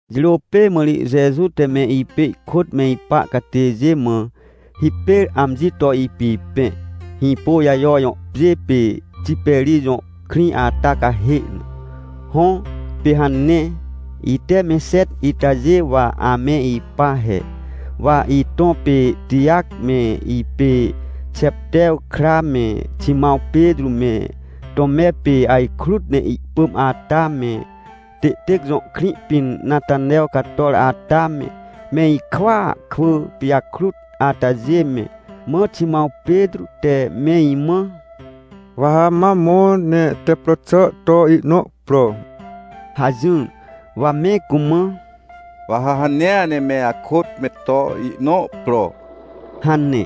Jirô pê mã ri Jeju te me ipê ihkôt me ipa catêjê mã hipêr amji to ipipẽ, Hĩpôjajo jõ pjê pê Tiperij jõ krĩ ata cahê na. Hõ, pê hane. Ite me xet itajê wa ame ipa he: Wa itõ pê Tijac me ipê Xeptew kra me, Ximãw Petrô me, Tome pê ajkrut ne ihpỳm ata me, Têtêc jõ krĩ pĩn Natanew cator ata me, me ikwỳa kwỳ pijakrut atajê me. Mã Ximãw Petrô te me imã: — Wa ha ma mõ ne tep pro xà to ihnõ pro — hajỹr. Wa me cumã: — Wa ha hanea ne me akôt me to ihnõ pro — hane.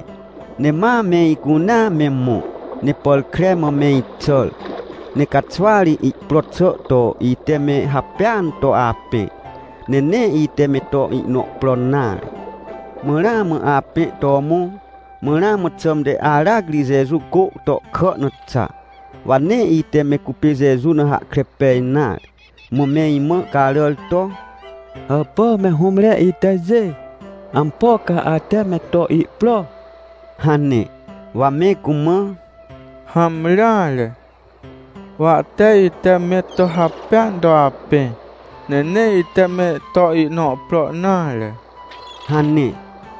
Ne ma me icunea me mõ, ne pàr kre mã me ixàr. Ne caxwa ri ihpro xà to ite me hapêan to apẽ, ne nee ite me to ihnõ pro nare. Mã ramã apẽ to mõ, mã ramã xãmte aracri Jeju cô tohkà na xa. Wa nee ite me cupê Jeju na hahkre pej nare. Mã me imã caràr to: — Hàpà me hũmre itajê? Ampo ca ate me to ihpro? — hane. Wa me cumã: — Hamreare, wa tee ite me to hapêan to apẽ, ne nee ite me to ihnõ pro nare — hane.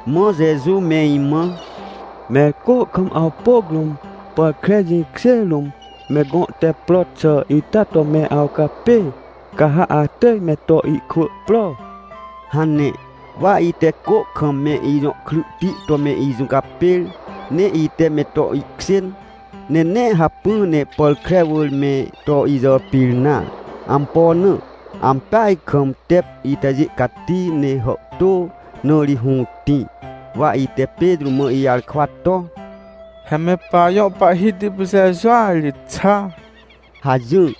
Mã Jeju me imã: — Mẽr cô kam awpôc rũm, pàr kre jĩkjê rũm me gõ tep pro xà ita to me awcapê, ca ha atỳj me to ihkwỳ pro — hane. Wa ite cô kam me ijõ kryhti to me ijũcapêr, ne ite me to ihkjên, ne nee hacpỹ ne pàr kre wỳr me to ijàpir nare. Ampo na? Ampeaj kam, tep itajê cati ne hàhtô, na ri hũtĩ. Wa ite Petrô mã ijarkwa to: — He me pajõ Pahhiti pê Jejua ri xa! — hajỹr.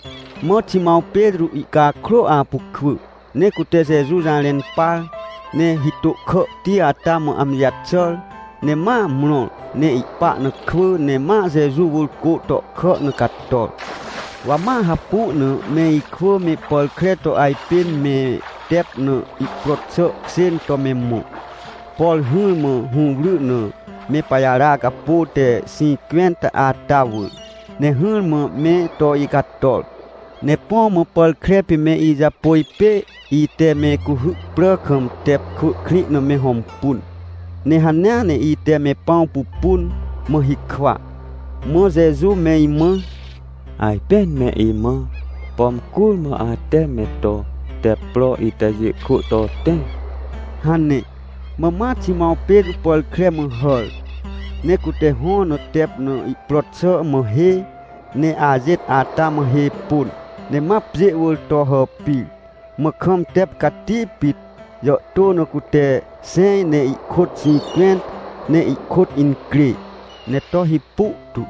Mã Ximãw Petrô ihcakrô apu kwỳ ne cute Jeju jarẽn par, ne hitô kàhti ata mã amji jaxàr, ne ma mrõr ne ihpa na kwỳ ne ma Jeju wỳr cô tohkà na cator. Wa ma hapu na me ikwỳ me pàr kre to ajpên me tep na, ihpro xà kjên to me mõ, por hỹrmã hũwry na me pajara capô te xĩncwẽnta ata wỳr, ne hỹrmã me to icator. Ne põ mã pàr kre pê me ijapôj pê, ite me cuhy prà kam tep kwỳ krĩ na me hõmpun. Ne hanea ne ite me pãw pupun, mã hikwa. Mã Jeju me imã: — Ajpên me imã, pom curmã ate me to tep pro itajê kwỳ to tẽ — hane. Mã ma Ximãw Petrô pàr kre mã hàr, ne cute hõ na tep pro xà mã hê, ne ajêt ata mã hê pôn, ne ma pjê wỳr to hàpir. Mã kam tep cati pit jàhtô na cute xẽj ne ihkôt xĩncwẽnta ne ihkôt incrê ne to hipu tu,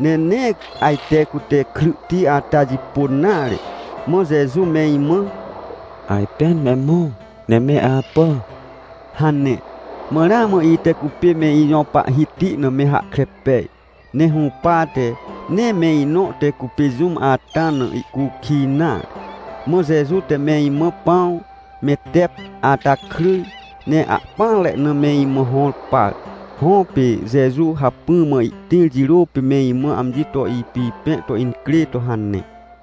ne nee ajte cute tep pro xà ata jipôn nare. Mã Jeju me imã: — Ajpên me mõ ne me apà — hane. Wa ramã ite cupê me ijõ Pahhiti na me hahkre pej. Ne hũpate, nee me inõ te cupê jũm ata na ihcukij nare. Mã Jeju te me imã pãw me tep ata kryj, ne ahpỹanre na me imã hõr par. Hõ, pê Jeju hacpỹ mã ihtĩr jirô pê me imã amji to ipipẽ to incrê to hane.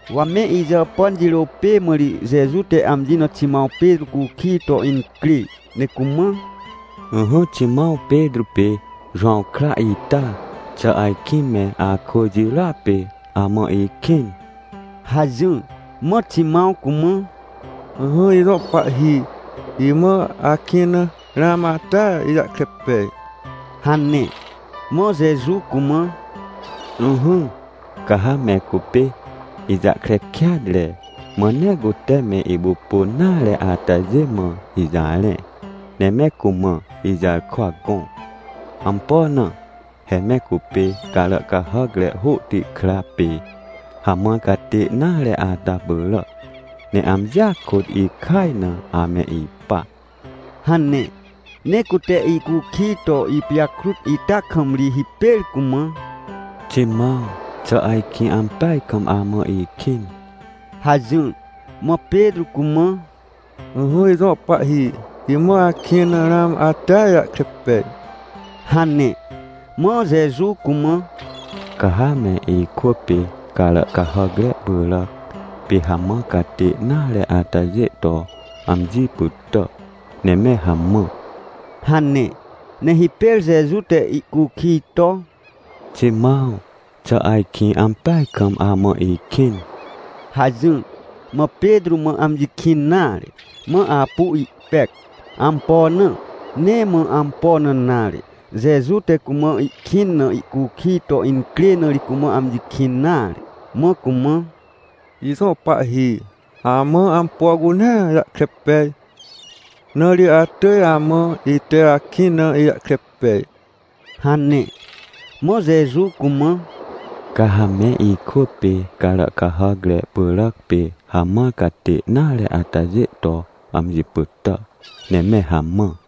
Wa me ijàpàn jirô pê mã ri Jeju te amji na Ximãw Petrô cukij to incrê ne cumã: — Ỹhỹ Ximãw Petrô pê Jowãw kra ita, xà ajkĩ me akwỳ jirôa pê amã ikĩn? — hajỹr. Mã Ximãw cumã: — Ỹhỹ ijõ Pahhi, imã akĩn na ramã atea ijahkre pej — hane. Mã Jeju cumã: — Ỹhỹ, ca ha me cupê ijahkre kêatre, mã nee cute me ipupun nare atajê mã ijarẽ, ne me cumã ijarkwa gõ. Ampo na? He me cupê carà cahàcre hôhti kra pê hamãr catê nare ata pyràac, ne amjia kôt ikaj na ame ipa — hane. Ne cute ihcukij to ipijakrut ita kam ri hipêr cumã: — Ximãw xà ajkĩ ampeaj kam amã ikĩn? — hajỹr. Mã Petrô cumã: — Ỹhỹ ijõ Pahhi, imã akĩn na ramã atea ijahkre pej — hane. Mã Jeju cumã: — Ca ha me ikwỳ pê carà cahàcre pyràc pê hamãr catê nare atajê to amji pytà ne me hamã — hane. Ne hipêr Jeju te ihcukij to: — Ximãw, xà ajkĩ ampeaj kam amã ikĩn? — hajỹr. Mã Petrô mã amji kĩn nare, mã apu ihpec. Ampo na? Nee mã ampo na nare, Jeju te cumã ihkĩn na ihcukij to incrê, na ri cumã amji kĩn nare, mã cumã: — Ijõ Pahhi, amã ampo cunea jahkre pej, na ri atỳj amã ite akĩn na ijahkre pej! — hane. Mã Jeju cumã: — Ca ha me ikwỳ pê carà cahàcre pyràc pê hamãr catê nare atajê to amji pytà ne me hamã.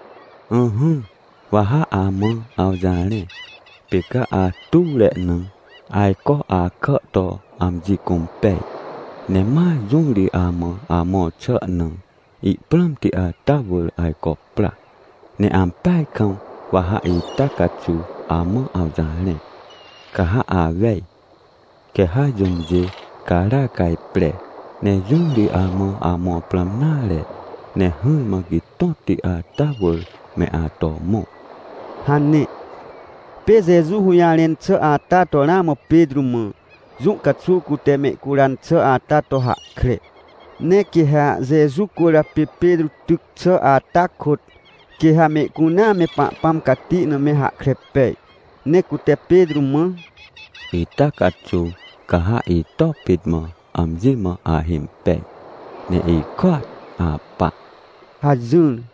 — Ỹhỹ, wa ha amã awjarẽ, pê ca atuwre na, ajco akà to amji cũmpej, ne ma jũ ri amã amõr xà na ihprãmti ata wỳr ajco pra. Ne ampeaj kam wa ha ita caxuw amã awjarẽ. Ca ha awej, quê ha jũmjê gara cajpre, ne jũ ri amã amõr prãm nare, ne hỹrmã gitõtti ata wỳr me ato mõ — hane. Pê Jeju hũjarẽn xà ata to ramã Petrô mã, jũ caxuw cute mehcuran xà ata to hahkre. Ne quê ha Jeju cwỳrjapê Petrô tyc xà ata kôt, quê ha mehcunea me Pahpãm cati na me hahkre pej. Ne cute Petrô mã: — Ita caxuw ca ha ito pit mã amji mã ahimpej, ne ikôat apa! — hajỹr.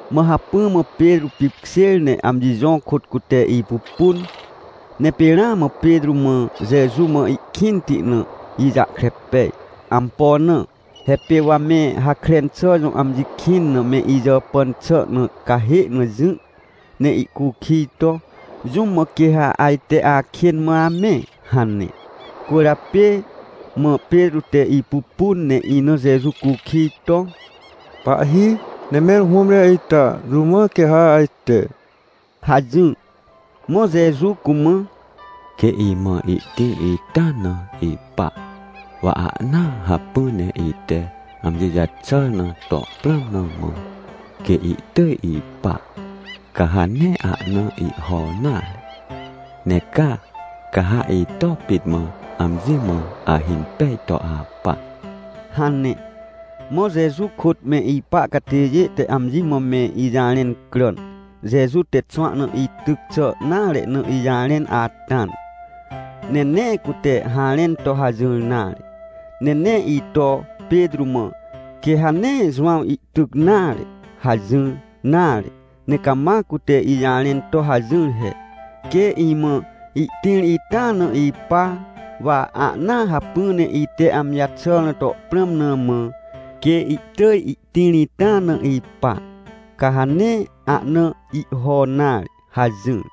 Mã hacpỹ mã Petrô pipkjêr ne amji jõ kôt cute ipupun. Ne pê ramã Petrô mã Jeju mã ikĩnti na ijahkre pej. Ampo na? He pê wa me Hakren xà jõ amji kĩn na me ijàpàn xà na cahê na jỹ ne ihcukij to: “Jũm mã quê ha ajte akên mã amẽ?” hane cwỳrjapê. Mã Petrô te ipupun, ne ina Jeju cukij to: — Pahhi, ne mẽr hũmre ita, jũ mã quê ha ajte? — hajỹr. Mã Jeju cumã: — Quê imã ihtĩr ita na ipa, wa ahnaa hacpỹ ne ite amji jaxàr na to prãm na mã, quê ihtỳj ipa, ca ha nee ahna ihho nare. Ne ca, ca ha ito pit mã amji mã ahimpej to apa — hane. Mã Jeju kôt me ipa catêjê te amji mã me ijarẽn cràn, Jeju te xwahna ityc xà nare na ijarẽn ata na. Ne nee cute harẽn to hajỹr nare. Ne nee ito Petrô mã: — Quê ha nee Jowãw ihtyc nare — hajỹr nare. Ne cama cute ijarẽn to hajỹr he: — Quê imã ihtĩr ita na ipa, wa ahnaa hacpỹ ne ite amji jaxàr na to prãm na mã, quê ihtỳj ihtĩr ita na ipa, ca ha nee ahna ihho nare — hajỹr.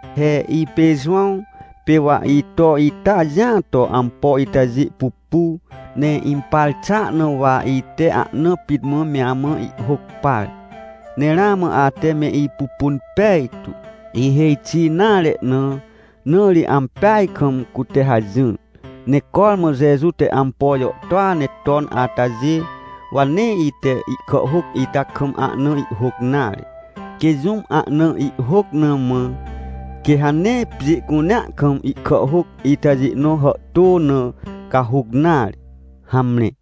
He ipê Jowãw, pê wa ito ita jĩa to ampo itajê pupu, ne impar xàa na wa ite ahna pit mã me amã ihhôc par. Ne ramã ate me ipupun pejtu, ihêj xi nare na, na ri ampeaj kam cute hajỹr. Ne cormã Jeju te ampo jàhtôa ne ton atajê, wa nee ite ihkàhhôc ita kam ahna ihhôc nare. Quê jũm ahna ihhôc na mã, quê ha nee pjê cunea kam ihkàhhôc itajê nõ hàhtô na cahuc nare. Hamre.